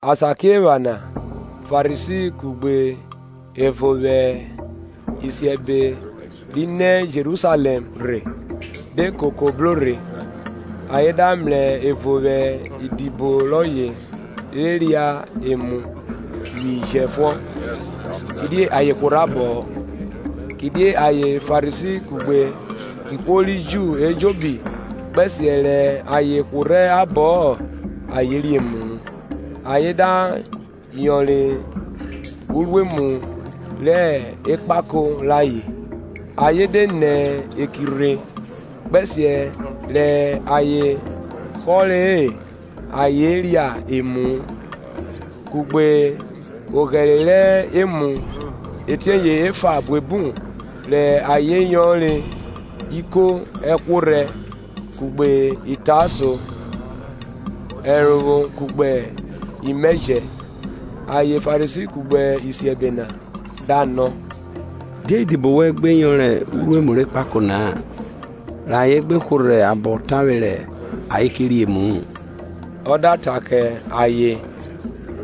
Asakiephana Farisi kugbe ẹvo vwẹ isiẹbe ri nẹ Jerusalẹm rhe de koko bro rhe, ayen da mrẹ ẹvo vwẹ idibo rọye re ria emu vwi jẹfuọn, kidie ayen hworhẹ abọ-ọ, Kidie ayen Farisi kugbe ihwo ri Ju ejobi, kpẹsiẹ rẹ ayen hworhẹ abọ-ọ, ayen rie emu-u, ayen da yọnre uruemu rẹ ekpako rayen ayen de nẹ eki rhe, kpẹsiẹ rẹ ayen họre-e, ayen ria emu-u; kugbe oghẹre rẹ emu etieye efa buebu rẹ ayen yọnre iko ẹhworhẹ, kugbe itaso, ẹrovwo kugbe imẹjẹ. Ayen Farisi kugbe isiẹbe na da nọ, Die idibo wẹn gbe yọnre iruemu re ẹkpakẹ na-a, rẹ ayen gbe hworhẹ abọ tavwe rẹ ayen ke ria emu-u? Ọ da ta kẹ ayen,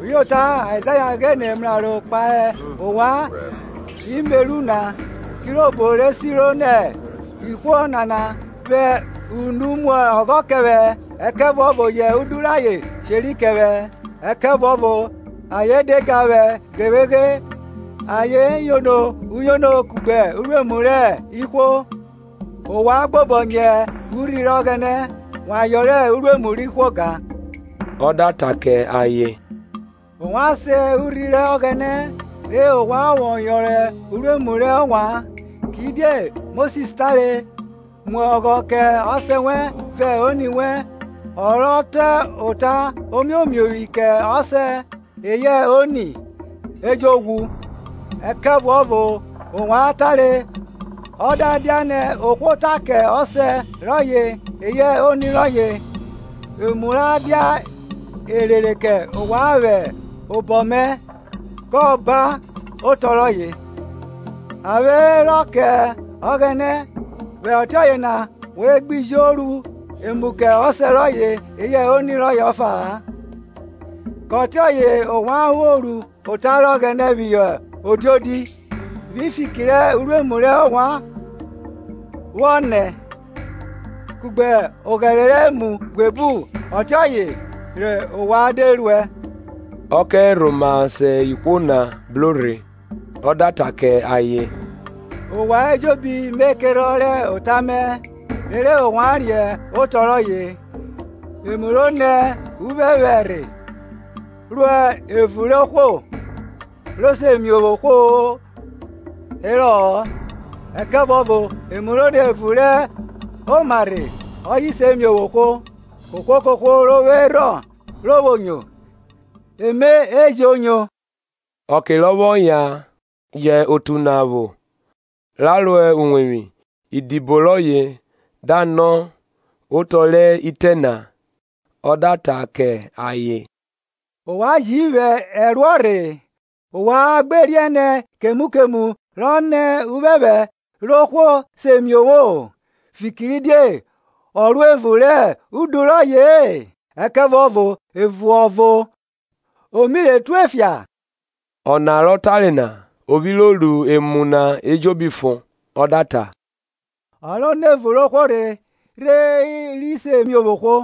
Uyota Aizaya ghine mraro kpahe ovwan imeru na, kirobo re siro nẹ, Ihwo nana vwẹ unu mu ọghọ kẹ vwẹ ẹkẹvuọvo yẹ udu rayen sheri kẹ vwẹ. Ẹkẹvuọvo ayen de ga vwẹ ghevweghe Ayen yono uyono kugbe uruemu rẹ ihwo. Ovwan gbobọnyẹ urhi rẹ Ọghẹnẹ, wa yọnre uruemu rẹ ihwo gan. Ọ da ta kẹ ayen, Ovwan sen urhi rẹ Ọghẹnẹ rẹ ovwan vwọ yọnre uruemu rẹ ovwan. Kidie Mosis tare, Mu ọghọ kẹ Ọsẹ wẹn vẹ oni wẹn ọ rọ ta ota omiomiovwi kẹ ọsẹ eyẹ oni, e jo ghwu; Ẹkẹvuọvo ovwan tare, Ọ da dianẹ ohwo ta kẹ ọsẹ rọye eyẹ oni rọye, Emu ra dia erere kẹ ovwan vwẹ obọ mẹ, Kọban, otọ rọye, A vwe rọ kẹ Ọghẹnẹ vwẹ ọtiọye na ovwan gbi jo ru emu kẹ ọsẹ rọye eyẹ oni rọye ọfa-a; Kẹ ọtiọye ovwan vwo ru ota rẹ Ọghẹnẹ phihọ odiodi, vwi fiki rẹ uruemu rẹ ovwan vwọ nẹ; kugbe oghẹre rẹ emu buebu ọtiọye rẹ ovwan de ruẹ. Ọ kẹ rhoma se ihwo na bro rhe, ọ da ta kẹ ayen, Ovwan ejobi me kerhọn rẹ ota mẹ, rere ovwan riẹn otọ rọye; emu ro nẹ uphẹphẹ rhe ro evun rẹ ohwo, ro se miovwo ohwo herọ-ọ; ẹkẹvuọvo emu ro nẹ evun rẹ oma rhe, ọye se miovwo ohwo. Kohwo kohwo ro vwo erhọn ro vwo nyo ẹme e jo nyo. Ọke rọ vwọ yan jẹ otu na vwo ra ro uwevwi, idibo rọye da nọ otọ rẹ itẹ na. Ọ da ta kẹ ayen, ovwan ji vwo ẹruọ rhe? Ovwan gbe riẹn nẹ kemu kemu ro nẹ uphẹphẹ ro ohwo se miovwo-o; fikiridie ọ ro evun rẹ udu rọye-e ẹkẹvuọvo evun ọvo, o mi re tue fia? Ọna rọ tare na, o vwi ro ru emu na ejobi fon. Ọ da ta, Ọ ro nẹ evun rẹ ohwo rhe ri se miovwo ohwo.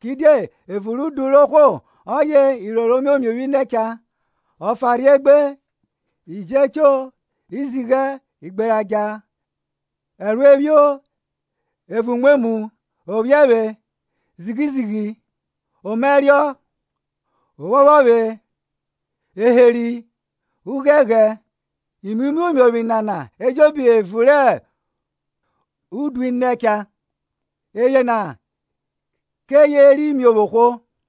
Kidie evun rẹ udu rẹ ohwo, ọye iroro imiomiovwi nẹ cha, ọfanrhie egbe, iji echo, izighe, igberadja, ẹruephio, evun umwemwu, ọphiẹvwẹ, zighi zighi, omaẹrio, ophọphọvwe, eheri, ughẹnghẹn. Imu imiomiovwi nana ejobi evun rẹ udu i nẹ cha, eyena keye ri miovwo ohwo.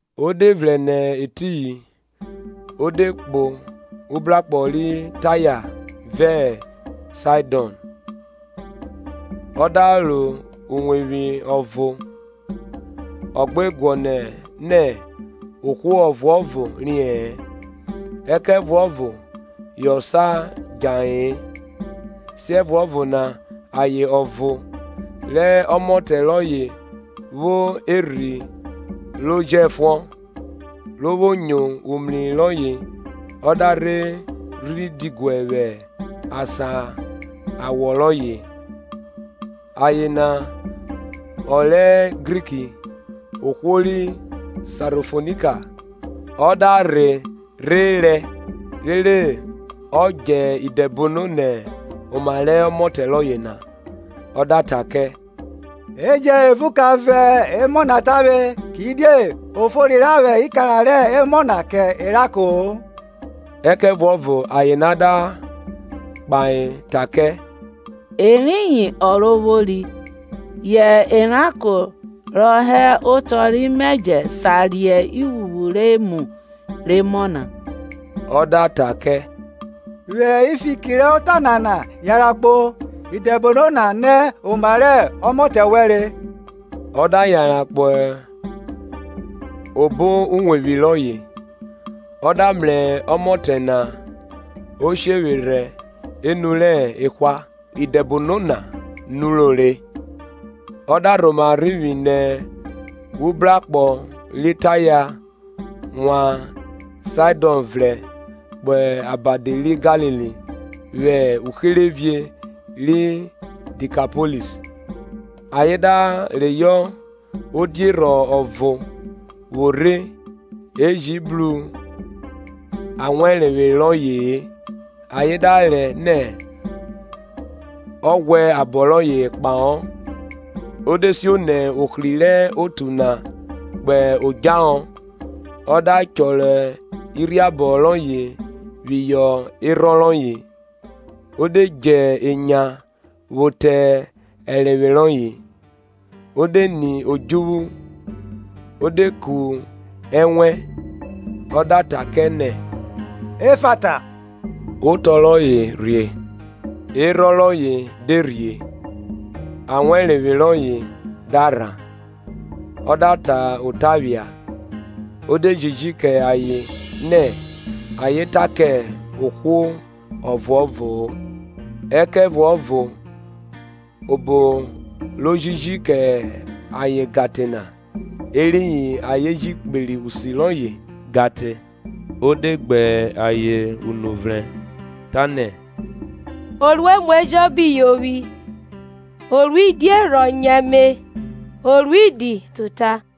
O de vrẹn nẹ etiyin o de kpo ubrakpo ri Taya vẹ Saidọn. Ọ da ro uwevwi ọvo ọ gbe guọnọ nẹ ohwo ọvuọvo riẹ-ẹn: ẹkẹvuọvo yọ sa djahe-e. Siẹvuọvo na aye ọvo, rẹ ọmọtẹ rọye vwo erhi ro jẹfuọn, ro vwo nyo umri rọye ọ da rhe rhi diguẹ vwẹ asan awọ rọye. Aye na ọ rẹ Griki, ohwo ri Sarofonika. Ọ da rhe rhe rẹ rere ọ djẹ idẹbono nẹ oma rẹ ọmọtẹ rọye na. Ọ da ta kẹ, E jẹn evun ka vọn emọ na tavwe. kidie o fori ra vwẹ ikara rẹ emọ na kẹ eranko-o. Ẹkẹvuọvo aye na da kpahe ta kẹ, Eriyin Ọrovwori, yẹ eranko rọ hẹ otọ rẹ imẹjẹ sa re ivwnvwu rẹ emu re emọ na. Ọ da ta kẹ, Vwi fiki rẹ ota nana yanran kpo, idẹbono na nẹ oma rẹ ọmọtẹ wẹn re. Ọ da yanran kpo obo uwevwi rọye, ọ da mrẹ ọmọtẹ na o shevwerhẹ enu rẹ ehwa, idẹbono na nuro re. Ọ da rhoma rhivwi nẹ ubrakpọ ri Taya, wan Saidọn vrẹn kpo abadi ri Galili, vwẹ uherevie ri Dikapoiis. Ayen da reyọ odierhọn ọvo vwo rhe e ji bru awẹrenvwe rọye-e ayen da rẹ nẹ ọ ghwẹ abọ rọye kpahọ. O de sio nẹ ohri rẹ otu na kpo odjahọ ọ da chọrọ irhiabọ rọye phihọ erhọn rọye, o de die enya vwo te ẹrenvwe rọye, O de ni odjuvwu, o de ku ẹnwẹn, ọ da ta kẹ nẹ, Effata, otọ rọye rhie. Erhọn rọye de rhie, awẹrenvwe rọye da rhan, ọ da ta ota phia. O de jiji kẹ ayen nẹ ayen ta kẹ ohwo ọvuọvo-o ẹkẹvuọvo obo ro jiji kẹ ayen gan te na, eriyin ayen ji kperi usi rọye gan te. O de gbe ayen unu vrẹn, ta nẹ, O ru emu ejobi yovwi, o ru odierhọn nyo ẹme, o ru idi ta ota.